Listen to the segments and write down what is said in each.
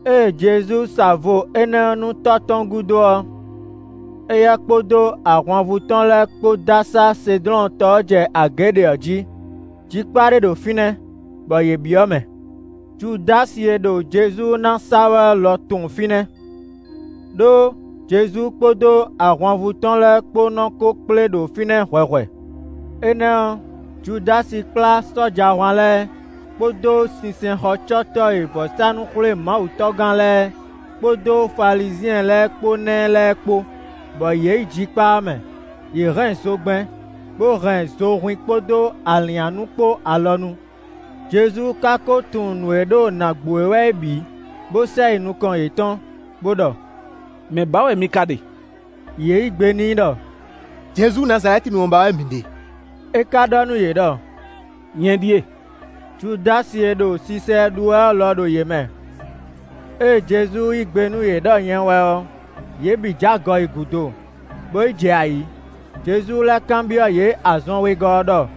Ée Jezu sa vo énɛ́ ɔ́ nú tɔ́ tɔn gúdo ɔ́, éyɛ́ kpódó ahwanvú tɔn lɛ́ɛ kpó dó asá Sedlɔ́n tɔ ɔ́ jɛ agě ɖě ɔ́ jí. Jikpá ɖé ɖo fínɛ́, bɔ yě byɔ́ mɛ. Judási e ɖo Jezu ná sa wɛ ɔ́ lɔ tunwun fínɛ́, ɖó Jezu kpódó ahwanvú tɔn lɛ́ɛ kpó nɔ ko kplé ɖo fínɛ́ hwɛhwɛ. Énɛ́ ɔ́, Judási kplá sɔ́jahwan lɛ́ɛ kpódó sinsɛnxɔcɔ́tɔ́ e vɔ̌sánú-xwlémawutɔ́gán lɛ́ɛ, kpódó Falizyɛn lɛ́ɛ kpó ná ɛ lɛ́ɛ kpó, bɔ yě yi jikpá ɔ́ mɛ. Yě hɛn zogbɛ́n, bó hɛn zohwín kpódó alǐnnyánú kpó alɔ nu. Jezu ka ko tunwun nǔ e ɖo nǎ gbo e wɛ é bǐ, bó sɛ yi nukɔn yětɔn, bó ɖɔ: “Mɛ̌ ba wɛ mi ka ɖe?” Yě yí gbe n'i ɖɔ: “Jezu Nazalɛ́tinu ɔ́ ba wɛ mǐ ɖe.” É ka ɖɔ nú yě ɖɔ: “Nyɛ ɖíe.” Judási e ɖo sisa ɛ ɖu wɛ ɔ́ lɔ ɖo yě mɛ. Ée Jezu yí gbe nú yě ɖɔ nyɛ wɛ ɔ́, yě bǐ j'agɔ yi gúdo, bó yi jɛ ayǐ. Jezu lɛ́ kanbyɔ́ yě azɔn wegɔ́ ɔ́ ɖɔ: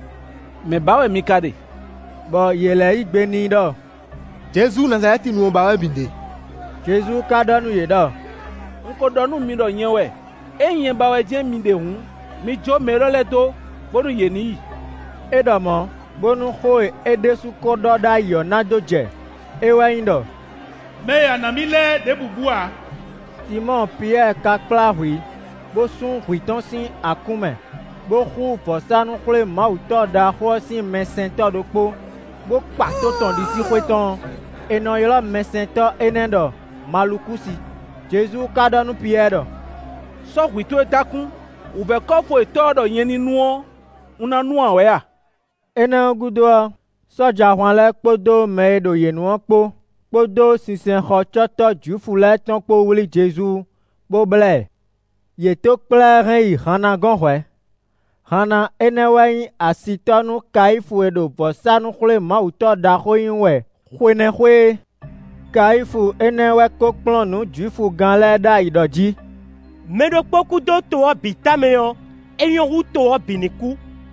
“Mɛ̌ ba wɛ mi ka ɖe?” Bɔ yě lɛ́ yí gbe n'i ɖɔ: “Jezu Nazalɛ́tinu ɔ́ ba wɛ mǐ ɖe.” Jezu ka ɖɔ nú yě ɖɔ: “Un ko ɖɔ nú mi ɖɔ nyɛ wɛ; ényí nyɛ ba wɛ jɛ́n mi ɖe hǔn, mi jǒ mɛ élɔ́ lɛ́ɛ dó, bónú yě ní yi.” É ɖɔ mɔ̌, bónú xó e é ɖésú ko ɖɔ ɖ'ayǐ ɔ́ na dó jɛ; é wɛ nyí ɖɔ: “Mɛ e a nǎ mì lɛ́ɛ ɖěbǔ bú ǎ.” Sinmɔ́ɔ Piyɛ́ɛ ka kplá hwǐ bó sún hwǐ tɔn sín akún mɛ, bó xú vɔ̌sánú-xwlémawutɔ́ ɖaxó ɔ́ sín mɛsɛntɔ́ ɖokpó, bó kpa tó tɔn ɖisíxwé tɔn ɔ́. È nɔ ylɔ́ mɛsɛntɔ́ énɛ́ ɖɔ Malukúsi. Jezu ka ɖɔ nú Piyɛ́ɛ ɖɔ: “Sɔ́ hwǐ towe dó akún. Wǔvɛ́ kɔ́fu e Tɔ́ ɔ́ ɖɔ nyɛ ní nu ɔ́, un ná nu ǎ wɛ a?” Énɛ́ gúdo ɔ́, sɔ́jahwan lɛ́ɛ kpódó mɛ e ɖo yě nu ɔ́ kpó, kpódó sinsɛnxɔcɔ́tɔ́ Jwifu lɛ́ɛ tɔn kpó wlí Jezu, bó blá ɛ. Yě tó kplá ɛ hɛn yi Hanna gɔ́n hwɛ̌. Hanna énɛ́ wɛ nyí asitɔ́ nú Kayífu e ɖo vɔ̌sánú-xwlémawutɔ́ ɖaxó nyí wɛ xwe énɛ́ xwe é. Kayífu énɛ́ wɛ ko kplɔ́n nǔ Jwifugán lɛ́ɛ ɖ'ayǐ ɖɔ jí: “Mɛ ɖokpó kú dó to ɔ́ bǐ tamɛ ɔ́, é nyɔ́ hú to ɔ́ bǐ ní kú.”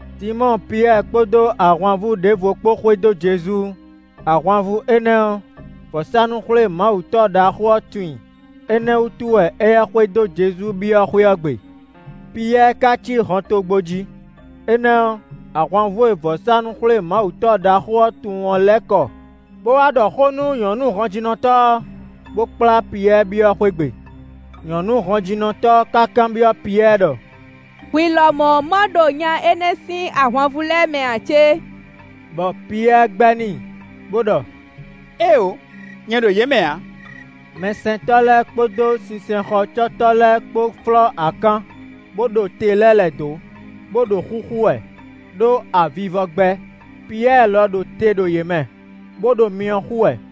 Sinmɔ́ɔ Piyɛ́ɛ kpódó ahwanvú ɖěvo kpó xwedó Jezu. Ahwanvú énɛ́ ɔ́, vɔ̌sánú-xwlémawutɔ́ ɖaxó ɔ́ tunwun i; énɛ́ wútu wɛ éyɛ́ xwedó Jezu byɔ́ xwé ɔ́ gbe. Piyɛ́ɛ ka cí hɔntogbó jí; énɛ́ ɔ́, ahwanvú e vɔ̌sánú-xwlémawutɔ́ ɖaxó ɔ́ tunwun ɔ́ lɛ́ kɔ bó wá ɖɔ xó nú nyɔ̌nu hɔnjínɔtɔ́ ɔ́, bó kplá Piyɛ́ɛ byɔ́ xwé gbe. Nyɔ̌nu hɔnjínɔtɔ́ ɔ́ ka kanbyɔ́ Piyɛ́ɛ ɖɔ: “Hwi lɔmɔ̌ ma ɖo nya énɛ́ sín ahwanvú lɛ́ɛ mɛ ǎ cé?” Bɔ Piyɛ́ɛ gbɛ́ n'i, bó ɖɔ: “Éeǒ, nyɛ ɖo yě mɛ ǎ.” Mɛsɛntɔ́ lɛ́ɛ kpódó sinsɛnxɔcɔ́tɔ́ lɛ́ɛ kpó flɔ́ akán, bó ɖo te lɛ́ lɛ̌ dó, bó ɖo xúxú wɛ, ɖó avivɔ gbɛ́. Piyɛ́ɛ lɔ ɖo te ɖo yě mɛ, bó ɖo myɔ xú wɛ.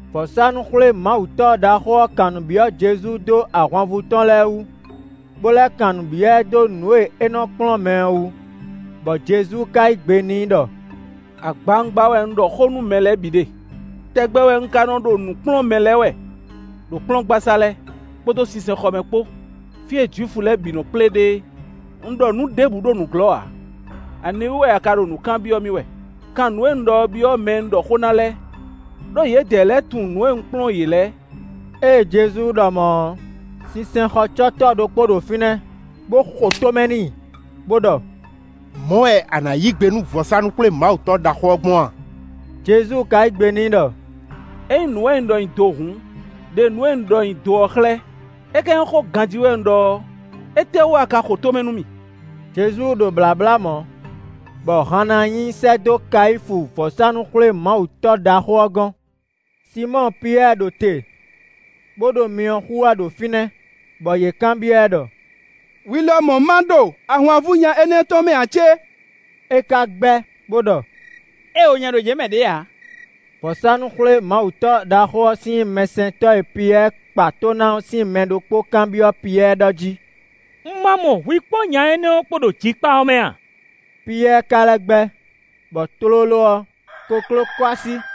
Vɔ̌sánú-xwlémawutɔ́ ɖaxó ɔ́ kan nǔ byɔ́ Jezu dó ahwanvú tɔn lɛ́ɛ wú, bó lɛ́ kan nǔ byɔ́ ɛ dó nǔ e é nɔ kplɔ́n mɛ ɔ́ wú. Bɔ Jezu ka yí gbe n'i ɖɔ: “Agbawungba wɛ un ɖɔ xó nú mɛ lɛ́ɛ bǐ ɖe. Tɛgbɛ wɛ un ka nɔ ɖo nǔ kplɔ́n mɛ lɛ́ɛ wɛ ɖo kplɔ́ngbasá lɛ́ɛ, kpódó sinsɛnxɔ mɛ kpó, fí e Jwifu lɛ́ɛ bǐ nɔ kplé ɖe é. Un ɖɔ nǔ ɖěbǔ ɖo nǔglɔ́ ǎ. Aniwú wɛ a ka ɖo nǔ kanbyɔ́ mì wɛ? Kan nǔ e un ɖɔ ɔ́ byɔ́ mɛ e un ɖɔ xó ná lɛ́ɛ, ɖó yědɛɛ lɛ́ɛ tunwun nǔ e un kplɔ́n yě lɛ́ɛ.” Ée Jezu ɖɔ mɔ̌ ɔ́, sinsɛnxɔcɔ́tɔ́ ɖokpó ɖo fínɛ́, bó xo tó mɛ n'i, bó ɖɔ: “Mɔ̌ wɛ a nǎ yí gbe nú vɔ̌sánú-xwlémawutɔ́ ɖaxó ɔ́ gbɔn a?” Jezu ka yí gbe n'i ɖɔ: “Ényí nǔ wɛ un ɖɔ nyi do hǔn, ɖe nǔ e un ɖɔ nyi do ɔ́ xlɛ́; é ka nyí xó ganjí wɛ un ɖɔ ɔ́, étɛ́wú a ka xo tó mɛ nú mì?” Jezu ɖo blǎblá mɔ̌, bɔ Hanna nyi i sɛ́ dó Kayífu vɔ̌sánú-xwlémawutɔ́ ɖaxó ɔ́ gɔ́n. Sinmɔ́ɔ Piyɛ́ɛ ɖo te, bó ɖo myɔ xú wɛ ɖo fínɛ́, bɔ yě kanbyɔ́ ɛ ɖɔ: “Hwi lɔmɔ̌ má ɖo ahwanvú nya énɛ́ tɔn mɛ ǎ cé?” É ka gbɛ́, bó ɖɔ: “Éeǒ, nyɛ ɖo yě mɛ ɖě ǎ!” Vɔ̌sánú-xwlémawutɔ́ ɖaxó ɔ́ sín mɛsɛntɔ́ e Piyɛ́ɛ kpa tó ná ɔ́ sín mɛ ɖokpó kanbyɔ́ Piyɛ́ɛ ɖɔ jí: “Un ma mɔ hwi kpó nya énɛ́ kpó ɖo jikpá ɔ́ mɛ a?” Piyɛ́ɛ ka lɛ́ gbɛ́, bɔ tlóló ɔ́, kokló kɔ́ así.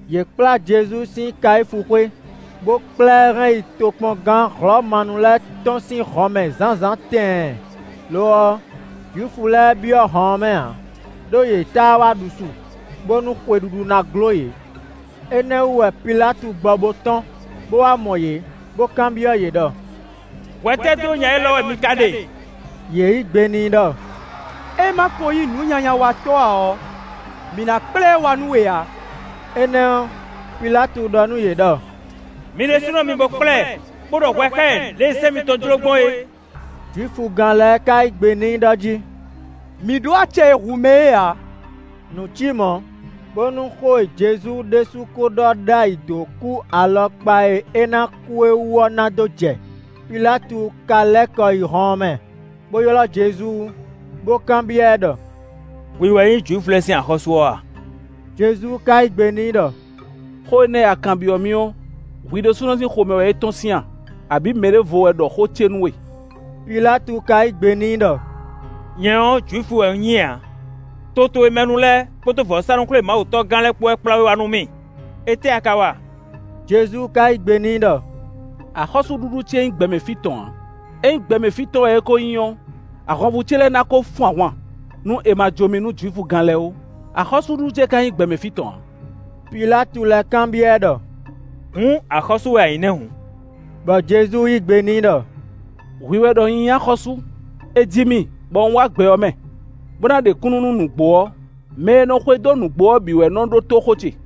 Yě kplá Jezu sín Kayífu xwé, bó kplá ɛ hɛn yi tokpɔngán Hlɔ̌manu lɛ́ɛ tɔn sín hɔnmɛ zǎnzǎn tɛɛn. Lo ɔ́, Jwifu lɛ́ɛ byɔ́ hɔn ɔ́ mɛ ǎ, ɖó yě táá wá ɖu su, bónú xwe ɖuɖu ná gló yě. Énɛ́ wú wɛ Pilátu gbɔ bo tɔ́n, bó wá mɔ yě, bó kanbyɔ́ yě ɖɔ: “Hwɛ tɛ́ dó nya élɔ́ wɛ mi ka ɖe?” Yě yí gbe n'i ɖɔ: “É ma ko nyí nǔnyanyawatɔ́ ǎ ɔ́, mǐ ná kplá ɛ wá nú we ǎ.” Énɛ́ ɔ́, Pilátu ɖɔ nú yě ɖɔ: “Mi ɖésúnɔ mi bo kplá ɛ, bó ɖɔ hwɛ xá ɛ lě e sɛ́n mitɔn jló gbɔn é.” Jwifugán lɛ́ɛ ka yí gbe n'i ɖɔ jí: “Mǐ ɖó acɛ e hu mɛ é ǎ.” Nǔ cí mɔ̌, bónú xó e Jezu ɖésú ko ɖɔ ɖ'ayǐ dó kú alɔkpa e é ná kú é wú ɔ́ ná dó jɛ. Pilátu ka lɛ́ kɔ yi hɔn ɔ́ mɛ, bó ylɔ́ Jezu, bó kanbyɔ́ ɛ ɖɔ: “Hwi wɛ nyí Jwifu lɛ́ɛ sín axɔ́sú ɔ́ a?” Jezu ka yí gbe n'i ɖɔ: “Xó énɛ́ e a kanbyɔ́ mì ɔ́, hwi ɖésúnɔ sín xomɛ wɛ é tɔ́n sín a, abǐ mɛ ɖěvo wɛ ɖɔ xó ce nú we?” Pilátu ka yí gbe n'i ɖɔ: “Nyɛ ɔ́, Jwifu wɛ un nyí a? To towe mɛ nu lɛ́ɛ kpódó vɔ̌sánú-xwlémawutɔ́gán lɛ́ɛ kpó wɛ kplá we wá nú mì. Étɛ́ a ka wa?” Jezu ka yí gbe n'i ɖɔ: “Axɔ́súɖuɖu ce nyí gbɛ mɛ fí tɔn ǎ; ényí gbɛ mɛ fí tɔn wɛ é ko nyí ɔ́, ahwanvú ce lɛ́ɛ ná ko fun ahwan, nú è ma jó mì nú Jwifugán lɛ́ɛ ó; axɔ́súɖuɖu ce ka nyí gbɛ mɛ fí tɔn ǎ.” Pilátu lɛ́ kanbyɔ́ ɛ ɖɔ: “Hǔn axɔ́sú wɛ a nyí nɛ́ hǔn?” Bɔ Jezu yí gbe n'i ɖɔ: “Hwi wɛ ɖɔ un nyí axɔ́sú. È ji mì, bɔ un wá gbɛ ɔ́ mɛ, bó ná ɖe kúnnu nú nǔgbó ɔ́. Mɛ e nɔ xwedó nǔgbó ɔ́ bǐ wɛ nɔ ɖótó xó ce.”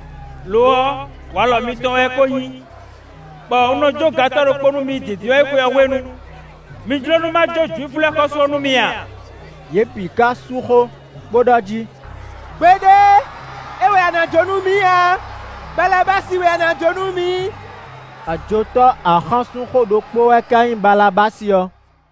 Lo ɔ́, walɔ mitɔn wɛ é ko nyí, bɔ un nɔ jó gantɔ́ ɖokpó nú mi Dǐndínwáyixwe ɔ́ hwenu. Mi jló nú má jó Jwifu lɛ́ɛ xɔ́sú ɔ́ nú mi a?” Yě bǐ ka sú xó, bó ɖɔ jí: “Gbeɖé, é wɛ a nǎ jǒ nú mǐ ǎ, Balabási wɛ a nǎ jó nú mǐ!” Ajotɔ́ axánsúnxó ɖokpó wɛ ka nyí Balabási ɔ́.